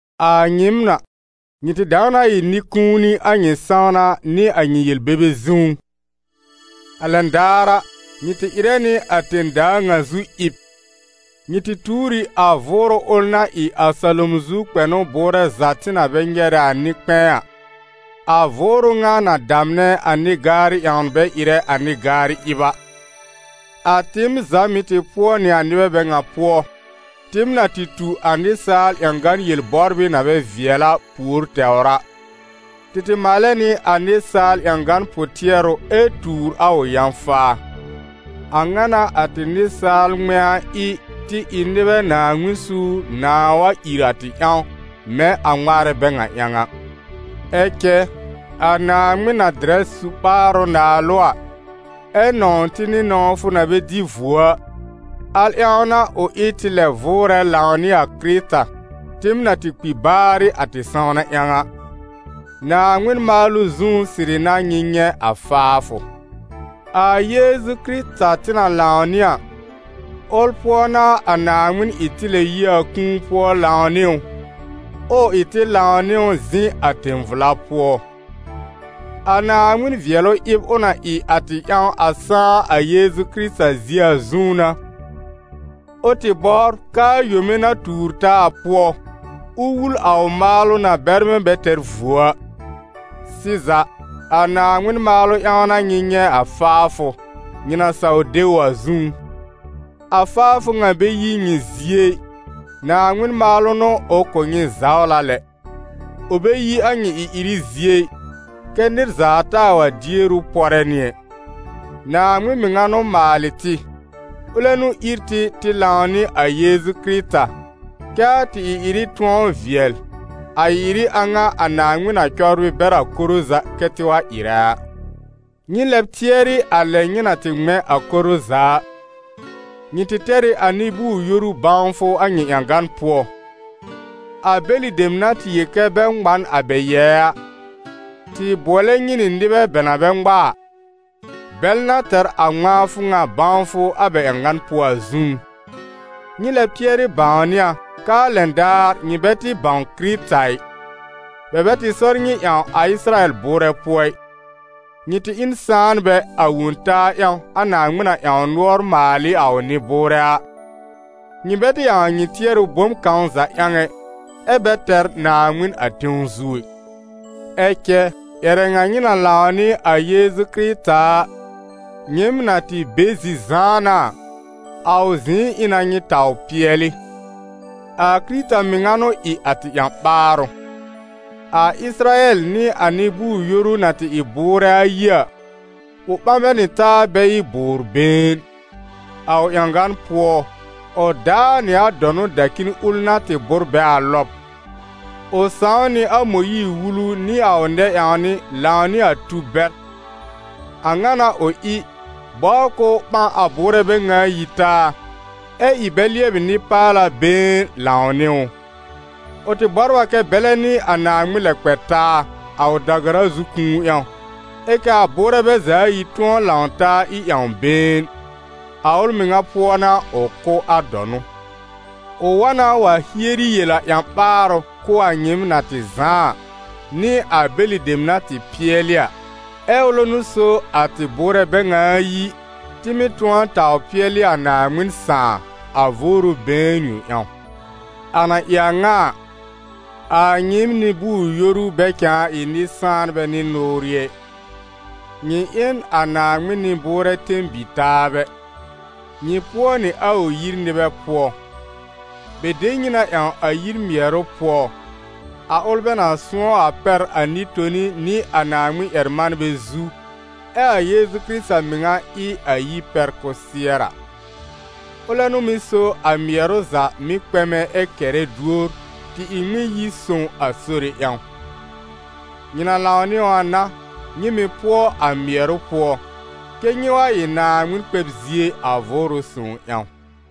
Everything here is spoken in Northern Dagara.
A nyɩɩm a, nyɩ tɩ dãw na ɩ nɩ-kũuni a nyɩ sãwna nɩ a nyɩ yel-bebe zũú. A lɛn daar a, nyɩ tɩ ɩrɛ nɩ a tẽ-daa ŋa zu ɩb, nyɩ tɩ tuur ɩ a vʋʋrʋ ʋl na ɩ a salom zu kpɛnʋ bʋʋrɛ za tɩ na bɛ nyɛrɛ a nɩ-kpɛ̃ɛ a, a vʋʋrʋ ŋa na damnɛ a nɩ-gaarɩ ƴãwn bɛ ɩrɛ a nɩ-garɩ ɩb a. A tɩɩm za mɩ̀ tɩ pʋɔ nɩ a nɩbɛ bɛ ŋa pʋɔ, tɩɩm na tɩ tu a nɩsaal ƴãgan yel-bɔbrɩ na bɛ vɩɛl a, pùor tɛwr a: tɩ tɩ maalɛ nɩ a nɩsaal ƴãgan pʋ-tɩɛrʋ ɛ tuur a ʋ yã-faa. A ŋa n'a a tɩ nɩsaal ŋmɛ̃a ɩ tɩ ɩ nɩbɛ Naaŋmɩn suur nãà wa ìr a tɩ ƴãw, mɛ̃ a ŋmaarɛ bɛ ŋa ƴãw a. Ɛ cɛ a Naaŋmɩn na dɩrɛ su-ɓaarʋ naalʋ a, ɛ nɔ̃w tɩ nɩ nɔ̃wfʋ na bɛ dɩ vuo a, al ƴãw n'a ʋ ɩ tɩ lɛb vʋʋrɛ lãw nɩ a Kɩrɩta, tɩɩm na tɩ kpi baarɩ a tɩ sãwna ƴãw a. Naaŋmɩn maalʋ zũú sɩrɩ n'a nyɩ nyɛ̃ a faafʋ. A Yeezu Kɩrɩta tɩ na lãw nɩ a, ʋl pʋɔ n'a a Naaŋmɩn ɩ tɩ lɛb yi a kũu pʋɔ lãw nɩ ʋ, ɛ ʋ ɩ tɩ lãw nɩ ʋ zɩ̃ a tẽ-vla pʋɔ. A Naaŋmɩn vɩɛlʋ ɩb ʋ na ɩ a tɩ ƴãw a sãá a Yeezu Kɩrɩta zie a zũú n'a, ʋ tɩ bɔbr k'aa yome na tuur taa a pʋɔ, ʋ wul a ʋ maalʋ na bɛrmɛ̃ bɛ tɛr vuo a. Sɩza, a Naaŋmɩn maalʋ ƴãw n'a nyɩ nyɛ̃ a faafʋ, nyɩ na saw de ʋ a zũú. A faafʋ ŋa bɛ yi nyɩ zie ɩ, Naaŋmɩn maalʋ n'ʋ ʋ kʋ̀ nyɩ zawla lɛ. Ʋ bɛ yi a nyɩ ɩ-ɩrɩ zie ɩ, kɛ́ nɩr za taa wa dier ʋ pɔrɛ nɩ ɛ. Naaŋmɩn mɩŋa n'ʋ maalɩ tɩ, ʋlɛ n'ʋ ír tɩ tɩ lãw nɩ a Yeezu Kɩrɩta, kɛ́ a tɩ ɩ-ɩrɩ tʋ̃ɔ vɩɛl, a ɩ-ɩrɩ a ŋa a Naaŋmɩn na cɔbrɩ bɛr a koro za kɛ́ tɩ wa ɩrɛ a. Nyɩ lɛb tɩɛrɩ a lɛ nyɩ na tɩ ŋmɛ̃ a koro za a. Nyɩ tɩ tɛr ɩ a nɩ-bʋʋr-yoru bãwfʋ a nyɩ ƴãgan pʋɔ; a bɛlɩ dem na tɩ yel kɛ bɛ ŋmã n a bɛ yɛɛ a, tɩ bʋɔlɛ nyɩ nɩ nɩbɛ bɛ na bɛ ŋma a, bɛl na tɛr a ŋmãafʋ ŋa bãwfʋ a bɛ ƴãgan pʋɔ a zũú. Nyɩ lɛ tɩɛrɩ bãwnɩ a k'aa lɛn daar nyɩ bɛ tɩ bãw Kɩrɩta ɩ, bɛ bɛ tɩ sɔr nyɩ ƴãw a Ɩsɩrayɛl bʋʋrɛ pʋɔ ɩ, nyɩ tɩ ɩ n sãanbɛ a Wõ-taa ƴãw a Naaŋmɩn na ƴãw nʋɔr maal ɩ a ʋ nɩ-bʋʋrɛ a, nyɩ bɛ tɩ ƴãw a nyɩ tɩɛrʋ bom kãw za ƴãw ɛ, ɛ́ bɛ tɛr Naaŋmɩn a tẽw zu ɛ. Ɛ cɛ ƴɛrɛ ŋa nyɩ na lãw nɩ a Yeezu Kɩrɩta a, nyɩɩm na tɩ be zi-zãana a, a ʋ zɩ̃ɩ ɩ na nyɩ taw pɩɛlɩ. A Kɩrɩta mɩŋa n'ʋ ɩ a tɩ ƴã-ɓaarʋ. A Ɩsɩrayɛl nɩ a nɩ-bʋʋr-yoru na tɩ ɩ bʋʋrɛ ayi a, ʋ ɓã bɛ nɩ taa bɛ ɩ bʋʋr-been. A ʋ ƴãgan pʋɔ, ʋ daa nɩ a dɔnʋ dacin ʋl na tɩ bʋ́r bɛ a lɔb. Ʋ sãw nɩ a Mõyiir-Wulu nɩ a ʋ nɛ-ƴãwnɩ lãw nɩ a tub bɛr. A ŋa n'a ʋ ɩ, bɔbr k'ʋʋ ɓã a bʋʋrɛ bɛ ŋa ayi taa, ɛ ɩ bɛ lɩɛbɩ nɩ-paala been lãw nɩ ʋ. Ʋ tɩ bɔbr a kɛ́ bɛlɛ nɩ a Naaŋmɩn lɛ kpɛ taa, a ʋ da-gara zu kũu ƴãw, ɛ k'aa bʋʋrɛ bɛ za ayi tʋ̃ɔ lãw taa ɩ ƴãw-been. A ʋl mɩŋa pʋɔ n'a ʋ kʋ́ a dɔnʋ. Ʋ wa na wa hieri yel a ƴã-ɓaarʋ kʋ̀ a nyɩɩm na tɩ zãá a, nɩ a bɛlɩ dem na tɩ pɩɛlɩ a. Ɛ ʋlɛ n'ʋ so a tɩ bʋʋrɛ bɛ ŋa ayi, tɩ mɩ́ tʋ̃ɔ taw pɩɛlɩ a Naaŋmɩn Sãà, a Vʋʋrʋ been yõ ƴãw. A na ɩ a ŋa a, a nyɩɩm nɩ-bʋʋr-yoru bɛ cãa ɩ nɩ-sãanbɛ nɩ nʋʋrɩ ɛ, nyɩ ɩ n a Naaŋmɩn nɩ-bʋʋrɛ tẽ-bi-taabɛ, nyɩ pʋɔ nɩ a ʋ yir nɩbɛ pʋɔ. Bɛ de nyɩ na ƴãw a yir mɩɛrʋ pʋɔ, a ʋl bɛ na sʋ̃ɔ́ a pɛr a nɩ-toni nɩ a Naaŋmɩn-ƴɛr-manbɛ zu, ɛ a Yeezu Kɩrɩta mɩŋa ɩ a yir pɛr kʋsɩɛr a. Ʋlɛ n'ʋ mɩ́ so a mɩɛrʋ za mɩ́ kpɛmɛ ɛ kɛrɛ duor tɩ ɩ Ŋmɩn-yi-sõw a Sore ƴãw. Nyɩ na lãw nɩ ʋ a n'a, nyɩ mɩ̀ pʋɔ a mɩɛrʋ pʋɔ, kɛ́ nyɩ wa ɩ Naaŋmɩn kpɛb zie a Vʋʋrʋ Sõw ƴãw.